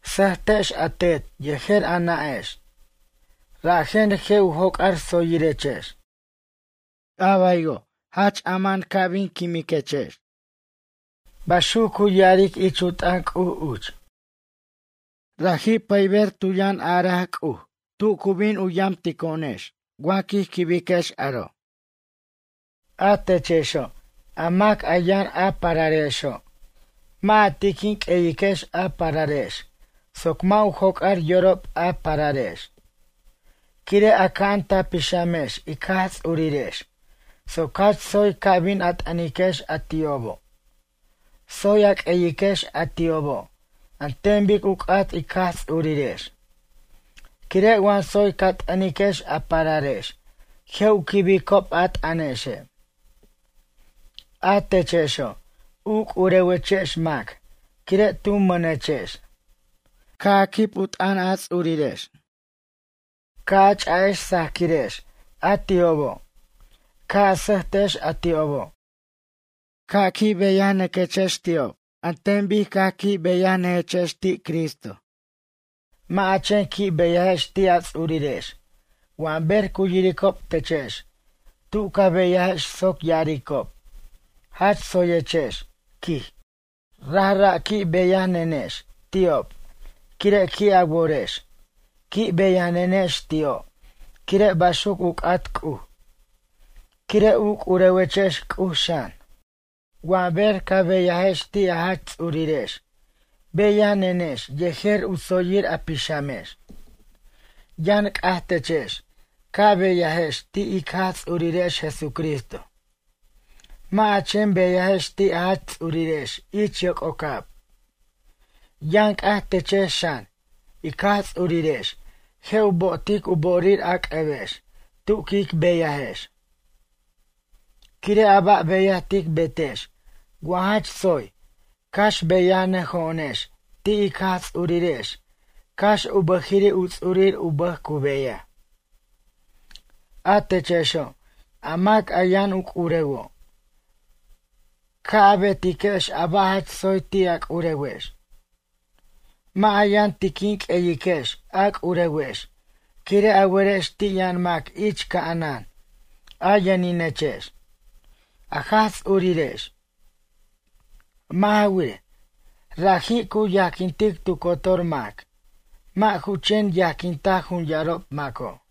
“Sʌtex a tetex yejer a nʌ'ex, rajen je' u joc'ar tsoyirechex. A baywo', jach ama'an ca' bin quimiquex.” Baxuc cu ya'aric ich u t'ʌn C'uj uch. Raji' pʌyber tu yʌn araj C'uj tu cu bin yamtico'onexe' wa quij quibiquex aro'. A techexo', a mac a yʌn a pararexo'. Mʌ' a tiquin q'ueyiquex a pararex soc mʌ' u joc'ar yorob a pararex. Quire' aca'an ta pixamex ic Jaj Ts'urirex soc jach tsoy ca bin a t'ʌniquex a ti'obo'. Tsoy a q'ueyiquex a ti'obo' an ten bic u c'at ic Jaj Ts'urirex. Quire' wa tsoy ca t'ʌniquex a pararex je' u quibicob a t'ʌnexe'. A techexo', u c'urewechex mac quire' tu mʌnechex. Ca' a quib u t'ʌn a ts'urirex. Ca' a ch'a'ex sajaquirex a ti'obo'. Ca' a sʌjtex a ti'obo'. Ca' qui' beyanʌquex ti'ob an ten bic caj qui' beyanʌjechex ti' Cristo. Mʌ' a chen qui' beyajex ti' a ts'urirex wa ber cu yiricob techex tu ca beyajex soc ya'aricob, jach tsoyechex, quij. Rajra' qui' beyanenex ti'ob quire' qui' a worex. Qui' beyanenex ti'o' quire' baxuc u c'at C'uj, quire' u curewechex C'uj xan. Wa ber ca beyajex ti' a jach ts'urirex, beyanenex yejer u tsoyir a pixamex. Yʌn c'aj techex, ca beyajex ti' ic Jaj Ts'urirex Jesucristo, mʌ' a chen beyajex ti' a jach ts'urirex ich yoc'ocab. Yʌn c'aj techex xan, ic Jaj Ts'urirex je' u bo'otic u bo'orir a c'ʌbex tu quic beyajex. Quire' a ba' beyaj tic betex wa jach tsoy, cax beyanʌjo'onex ti' ic Jaj Ts'urirex cax u bʌjiri' u ts'urir u bʌj cu beyaj. A techexo', a mac a yʌn u c'urewo'. Ca' a betiquex a ba' jach tsoy ti' a c'urewex. Mʌ' a yʌn tiquin q'ueyiquex a c'urewex quire' a werex ti' yʌn mac ich ca'anan a yʌninechex, a Jaj Ts'urirex. Mʌ' ja wirej, raji' cu yajquintic tu cotor mac, mʌ' ju chen yajquinta jun yarob maco'.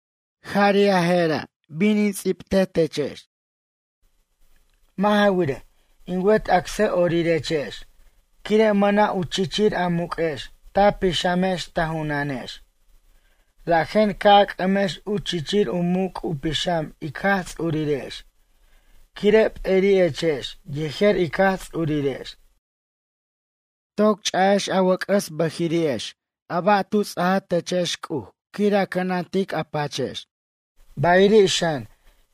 Jari' a je'ra' bin in ts'ibtej techex. Mʌ' ja wirej, in wet acsʌ'orirechex quire' mʌna' u chichir a muq'uex ta pixamex ta junanex, rajen ca' a c'ʌmex u chichir u muc' u pixam ic Jaj Ts'urirex, quire' p'eri'echex yejer ic Jaj Ts'urirex. Toc ch'ajex a wʌc'ʌs a bʌjiri'exe' a ba' tu ts'a techex C'uj quir a cʌnantic a pachex, bayiri' xan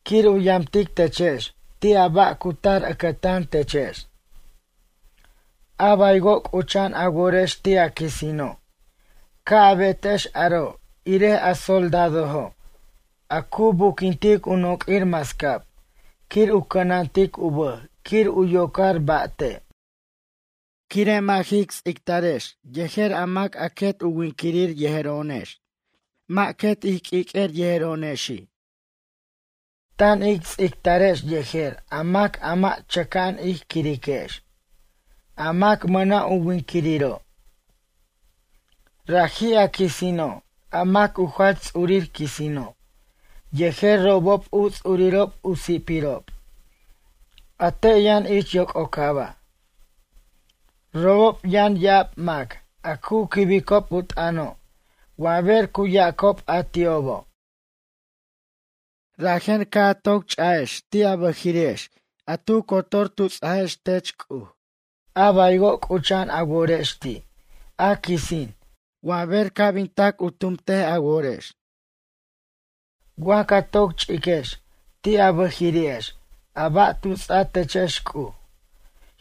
quir u yamtic techex ti' a ba' cu tar ʌcʌtan techex. A baywo' c'ucha'an a worex ti' a quisino'. Ca' a betex aro' irej a soldadojo' a cu buquintic u noq'uir mascab quir u cʌnantic u bʌj quir u yocar ba' te'. Quire' mʌ' jic ts'ictarex yejer a mac a quet u winquirir yejero'onex, mʌ' quet ij q'uiq'uer yejero'onexi'. Tan ic ts'ictarex yejer a mac a mʌ' chʌca'an ij quiriquex, a mac mʌna' u winquiriro'. Raji', a quisino', a mac u jach ts'urir quisino', yejer robob u ts'urirob u si'pirob, a te' yʌn ich yoc'ocaba'. Robob yʌn ya'ab mac a cu quibicob u t'ʌno' wa ber cu yacob a ti'obo'. Rajen ca' a toc ch'ajex ti' a bʌjirex a tu cotor tu ts'ajex tech C'uj, a baywo' c'ucha'an a worex ti' a quisin wa ber ca' bin tac u tumt a worex. Wa ca toc ch'iquex ti' a bʌjirex a ba' tu ts'a techex C'uj,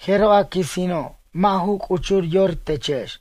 jeroj a quisino' mʌ' ju c'uchur yor techex.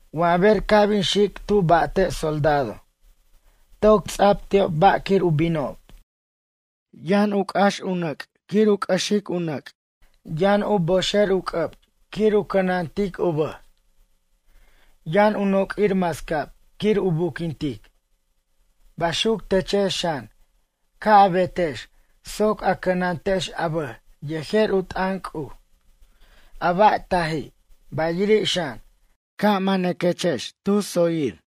Wa ber ca' bin xic tu ba'te' soldado, toc ts'a'b ti'ob ba' quir u binob. Yʌn c'ax u nʌc' quir u c'ʌxic u nʌc'. Yʌn u boxer u c'ʌb quir u cʌnantic u bʌj. Yʌn u noq'uir mascab quir u buquintic. Baxuc techex xan, ca' a betex soc a cʌnantex a bʌj yejer u t'ʌn C'uj, a ba' taji', bayiri' xan, ca' manaquechex tu tsoyir.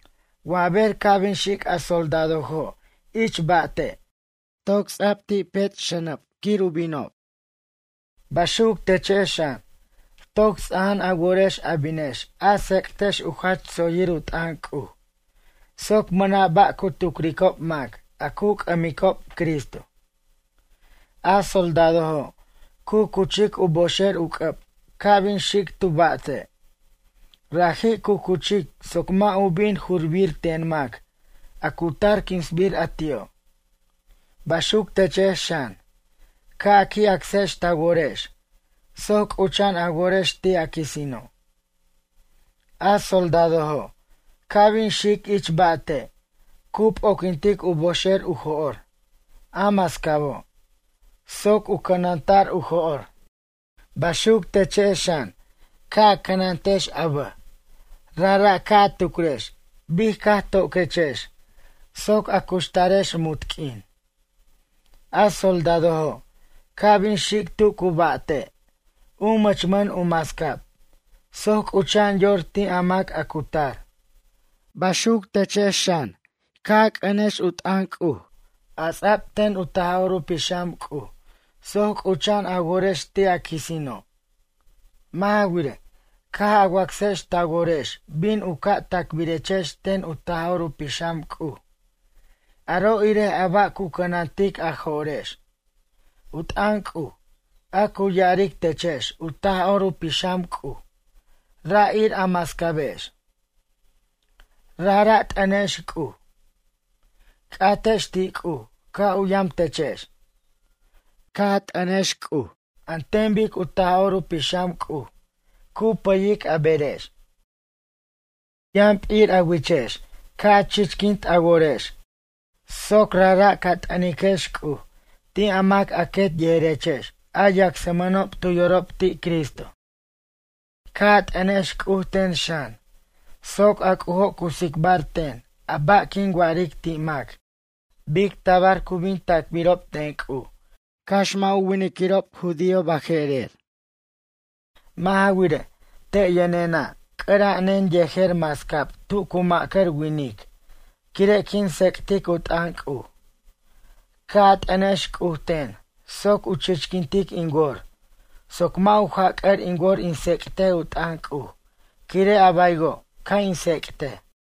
Wa ber ca' bin xic a soldadojo' ich ba'te', toc ts'ab ti' pech' xʌnab quir u binob. Baxuc techex xan, toc ts'ajan a worex a binex a tsec'tex u jach tsoyir u t'ʌn C'uj, soc mʌna' ba' cu tucricob mac a cu c'ʌmicob Cristo. A soldadojo' cu cuchic u boxer u c'ʌb ca' bin xic tu ba'te', raji' cu cuchic soc mʌ' u bin jurbir ten mac a cu tar quinsbir a ti'o'. Baxuc techex xan, ca' a qui' acsex ta worex soc c'ucha'an a worex ti' a quisino'. A soldadojo' ca' bin xic ich ba'te', cu p'oquintic u boxer u jo'r, a mascabo', soc u cʌnanta'r u jo'r. Baxuc techex xan, ca' a cʌnantex a bʌj, rajra' ca' a tucrex bic caj toquechex soc a cuxtarex munt q'uin. A soldadojo' ca' bin xic tu cu ba'te', u mʌchmʌn u mascab soc c'ucha'an yor ti' a mac a cu tar. Baxuc techex xan, ca' a c'ʌniquex u t'ʌn C'uj, a ts'ab ten u Taj'or Pixam C'uj soc c'ucha'an a worex ti' a quisino'. Mʌ' ja wirej, caj a wacsex ta worex bin u ca' tacbirechex ten u Taj'or u Pixam C'uj, aro' irej a ba' cu cʌnantic a jo'rex. U t'ʌn C'uj, a cu ya'aric techex u Taj'or u Pixam C'uj ra' ir a mascabex. Rajra' t'ʌnex C'uj. C'atex ti' C'uj ca' u yam techex. Ca' a t'ʌniquex C'uj an ten bic u Taj'or u Pixam C'uj cu pʌyic a berex. U yʌn p'ir a wichex ca' a chichquint a worex soc rajra' ca t'ʌniquex C'uj ti' a mac a quet yejerechex a yacsmʌnob tu yorob ti' Cristo. Ca' a t'ʌnex C'uj ten xan, soc a C'ujo' cu tsicbar ten a ba' quin wa'aric ti' mac bic tabar cu bin tacbirob ten C'uj, cax mʌ' u winiquirob judío baje'rer. Mʌ' ja wirej, te' yʌnenena' c'ʌra'anen yejer mascab tu cu ma'cʌr winic quire' quin tsec'tic u t'ʌn C'uj. Ca' a t'ʌnex C'uj ten soc u chichquintic in wor soc mʌ' u jac'ʌr in wor in tsec'tej u t'ʌn C'uj quire' a baywo' ca' in tsec'tej.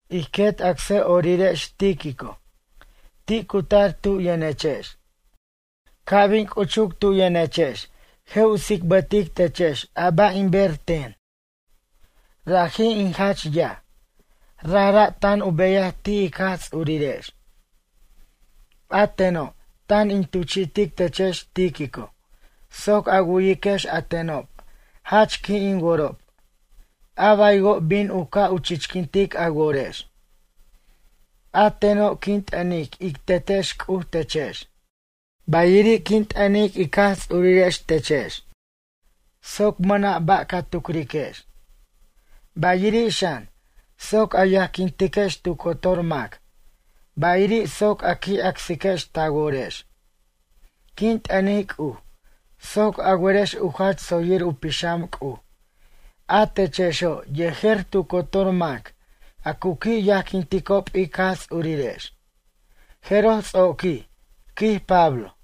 Ij quet acsʌ'orirex Tíquico, ti' cu tar tu yʌnechex. Ca' bin c'uchuc tu yʌnechex je' u tsicbʌtic techex a ba' in ber ten. Raji' in jach yaj, rajra' tan u beyaj ti' ic Jaj Ts'urirex. A teno' tan in tuchi'tic techex Tíquico soc a wu'yiquex a tenob jach qui' in worob, a baywo' bin u ca' u chichquint a worex. A teno' quin t'ʌnic ic Tetex C'uj techex, bayiri' quin t'ʌnic ic Jaj Ts'urirex techex soc mʌna' ba' ca tucriquex. Bayiri' xan, soc a yajquintex tu cotor mac, bayiri' soc a qui' acsiquex ta worex. Quin t'ʌnic C'uj soc a werex u jach tsoyir u pixam C'uj, a techexo' yejer tu cotor mac a cu qui' yajquinticob ic Jaj Ts'urirex. Jeroj ts'oqui, quij Pablo.